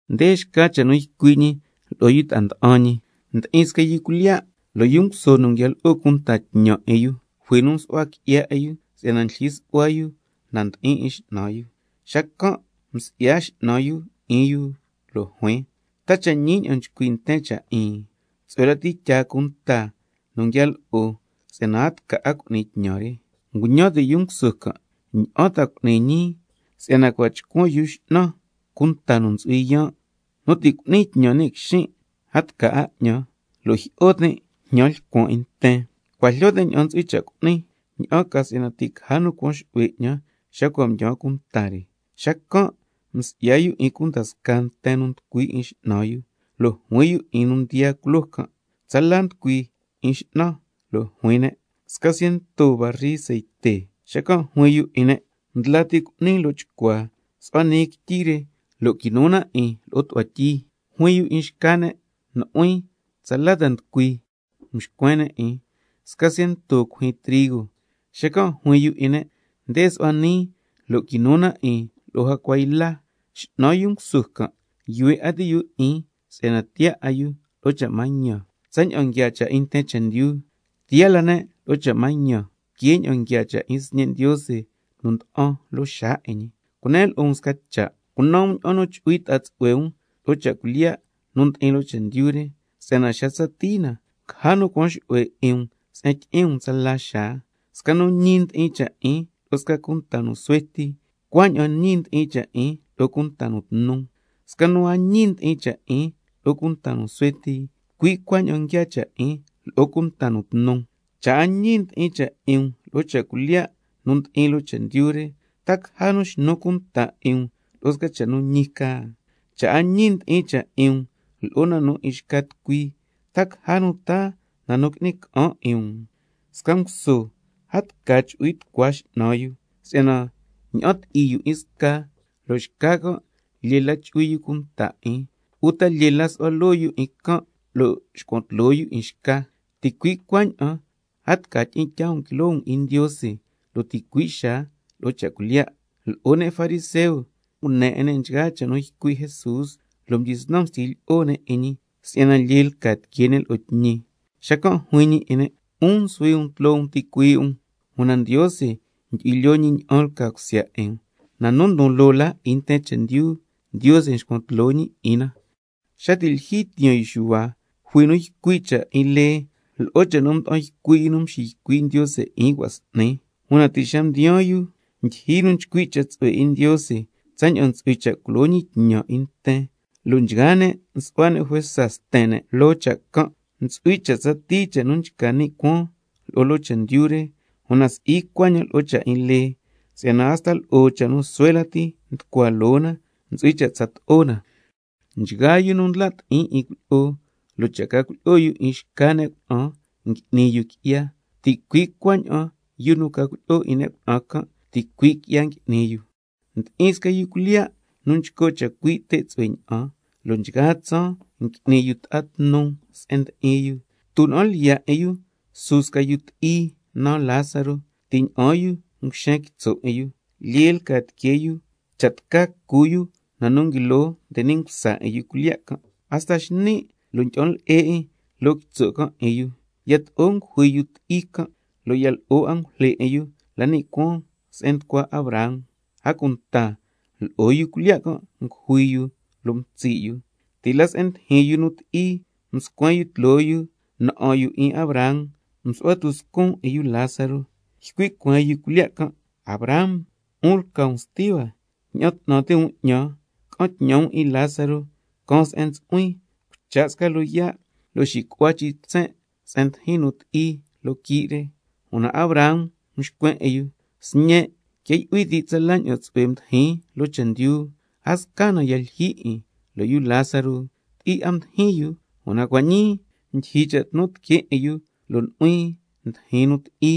Nde xca cha' nu ycui' ñi lo'o yu ta'a nda'an ñi: Ndi'in sca yu cuilyiya', lo' yu nguso nu nguia lo'o cunta tñan 'in yu, jui nu msu'hua qui'ya 'in yu si'yana ndlyijyi su'hua yu na nu ndi'in 'in x'nan yu. Xacan' msi'ya x'nan yu 'in yu lo' juin: ¿Ta cha' ñi ña'an nchcui' nten cha' 'in? Tsu'hue lati cha' tyaa cunta nu nguia lo'o si'yana a tca 'a cu'ni tñan re. Nguñan ti' yu nguso can': ¿Ña'an ta cu'nin ñii, si'yana cua' chcuan yu x'nan cunta nu ntsu'hui yaan'? Nu ti' cu'nin tñan ni' quixin' a tca 'a 'ñan, lo' jyi'o tin' jñan lcuan 'in nten. Cua' jlyo tin' ña'an ntsu'hui cha' cu'nin, ña'an ca si'yana ti' caja nu cuan xu'hue 'ñan xa cua' mdyaan cunta re. Xacan' msi'ya yu 'in cunda scaa nten nu nducui 'in x'nan yu, lo' juin yu 'in nu mdiyaa culoo can': ¿Tsala nducui 'in yu x'nan? Lo' juin ne': Sca ciento barri ceite. Xacan' juin yu lo'o ne': Ndla ti cu'ni lo' chcua, su'hua nii quityi re lo' quinu na 'in lo'o tu'hua tyi. Juin yu 'in xca ne': Nu'huin, ¿tsala nducui? Mxcuen ne' 'in: Sca ciento cuijyin trigo. Xacan' juin yu lo'o ne': Nde su'hua nii lo' quinu na 'in lo'o jacua yla. X'nan yu nguso can' yuhue 'a ti' yu 'in si'yana tiyaa 'a yu lo'o cha' mañan. Tsaña'an nguiaa cha' 'in nten chendyu, tiyaa la ne' lo'o cha' mañan que ña'an nguiaa cha' 'in sñe' Ndiose nu nda'an loo xaa 'in ñi. Cunen lo'o um sca cha': Cunan um ña'an nu chu'hui ta'a tsu'hue um lo'o cha' cuilyiya' nu ndi'in loo chendyu re, si'yana xa tsatii na, caja nu cuan xu'hue 'in um sca se'en tyi'in um ni' cuaan tsala xaa. Sca nu ñi ndi'in cha' 'in lo'o sca cunta nu suhue ti, cui' cuaña'an ñi ndi'in cha' 'in lo'o cunta nu tnu. Sca nu a ñi ndi'in cha' 'in lo'o cunta nu suhue ti, cui' cuaña'an nguiaa cha' 'in lo'o cunta nu tnu. Cha' a ñi ndi'in cha' 'in um lo'o cha' cuilyiya' nu ndi'in loo chendyu re, ¿ta caja nu xnu cunta 'in um lo'o sca cha' nu ñi ca? Cha' a ñi ndi'in cha' 'in um lo'o na 'in xca tucui, ¿ta caja nu taa na nu qui'ni ca'an 'in um? Sca nguso, a tca chu'hui tucua x'nan yu, si'yana ña'an ti'i yu 'in sca lo' xca can' lyee la chu'hui yu cunta 'in, uta lyee la su'hua loo yu 'in can' lo' xcuan tloo yu 'in xca. Ticui' cuaña'an a tca tyi'in tyaa um quiloo um 'in Ndiose lo' ticui' xaa lo'o cha' cuilyiya'. Lo'o ne' fariseo ngune 'in ne' nchgaa cha' nu ycui' Jesús, lo' mdyisnan mstyi lyi'o ne' 'in ñi si'yana lyee 'a lca tiquee ne' lo'o tñi. Xacan' juin ñi 'in ne': 'Un nsuhui um tloo um ticuii' um, una Ndiose ndyu'hui lyoo ñi ña'an lca cusya 'in um. Na nu ndon loo 'in nten chendyu, Ndiose nxcuan tloo ñi 'in na. Xa ti' lyijyi tiyaan yu Xuhua, jui nu ycui' cha' 'in lee lo'o cha' nu mda'an ycui' yu nu mxiycui' Ndiose 'in cua' s'ni, una ti' xa mdiyaan yu ndyijyi nu nchcui' cha' tsu'hue 'in Ndiose tsaña'an ntsu'hui cha' culo ñi tñan 'in nten, lo' nchgaa ne' nsu'hua ne' juesa sten ne' loo cha' can'. Ntsu'hui cha' tsatii cha' nu nchca ni' cuaan lo'o loo chendyu re, una si'i cuaña'an lo'o cha' 'in lee, si'yana hasta lo'o cha' nu suhue lati nducua loo na ntsu'hui cha' tsato'o na. Nchgaa yu nu ndla' ti'in cuilyi'o, lo' cha' ca cuilyi'o yu 'in xca ne' cuna'an ngui'ni yu qui'ya, ticui' cuaña'an yu nu ca cuilyi'o 'in ne' cuna'an can', ticui' qui'ya ngui'ni yu. Ndi'in sca yu cuilyiya' nu nchco' chacui' te' tsu'hue ña'an, lo' nchgaa tsaan ngui'ni yu ta'a nu tnu se'en ndi'in yu. Tuna'an lyiya' 'in yu su sca yu ti'i naan Lázaro, ti' ña'aan yu nguxen quitso' 'in yu, lyee lca tiquee yu cha' tca cu yu na nu nguilo nde ni' msa 'in yu cuilyiya' can', hasta xni' lo' ndyi'an le'e 'in loo quitso' can' 'in yu. Yato'o ngujui yu ti'i can', lo' ya lo'o angujle 'in yu la ni' cuaan se'en nducua Abraham. A cunta lo'o yu cuilyiya' can' ngujui yu lo' mtsi' yu. Ti' la se'en ndijin yu nu ti'i mscuen yu tloo yu, na'an yu 'in Abraham msu'hua tuscun 'in yu Lázaro. Ycui' cueen yu cuilyiya' can': Abraham, 'un nu lca sti hua, ña'an 'tnan ti' um 'ñan, ca'an tñan um 'in Lázaro caan se'en ntsu'huin, cucha' sca loyaa' lo'o tyi'a lo' xicu'hua chin' tsen' se'en ndijin nu ti'i loo quii' re. Una Abraham mxcuen 'in yu: Sñen', quia yu'hui ti' tsala ña'an tsu'hue mdi'in loo chendyu, a sca na ya lyijyi 'in, lo' yu Lázaro ti'i 'a mdijin yu, una cua' ñii ndyijyi cha' tnu tiquee 'in yu, lo' nu'huin ndijin nu ti'i.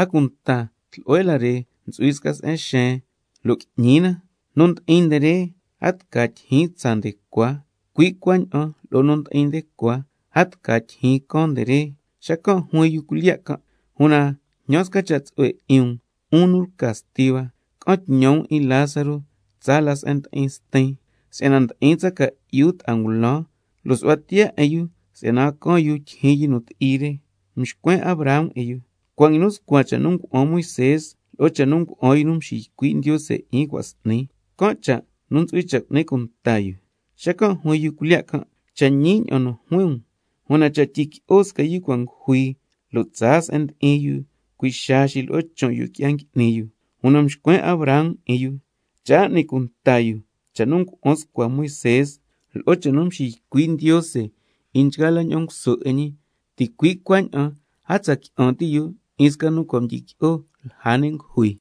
A cunta tlu'hue la re ntsu'hui sca se'en xeen lo' qui'ñi na, nu ndi'in nde re a tca tyijyin tsaa nde cua, cui' cuaña'an lo'o nu ndi'in nde cua, a tca tyijyin caan nde re. Xacan' juin yu cuilyiya' can': Una jñan sca cha' tsu'hue 'in um, 'un nu lca sti hua, ca'an tñan um 'in Lázaro tsaa la na'an 'in stin, si'yana ti' ndi'in cha ca'yu ta'a ngulan, lo' su'hua tiyaa 'in yu si'yana a caan yu tyijyin yu nu ti'i re. Mxcuen Abraham 'in yu: Cua' nguinu scua cha' nu ngua'an Moisé lo'o cha' nu ngua'an yu nu mxiycui' Ndiose 'in cua' s'ni, can' cha' nu ntsu'hui cha' cu'ni cunta yu. Xacan' juin yu cuilyiya' can': Cha' ñi ña'an nu juin um, una cha' tyiqui'o sca nu cua' ngujui lo' tsaa se'en ndi'in yu, cui' xaa xilo'o chon' yu qui'ya ngui'ni yu. Una mxcuen Abraham 'in yu: Cha' a n'ni cunta yu cha' nu ngua'an scua Moisé lo'o cha' nu mxiycui' Ndiose 'in nchgaa la nguso 'in ñi, ticui' cuaña'an a tsa qui'an ti' yu 'in sca nu cua' mdyiqui'o lja ne' ngujui.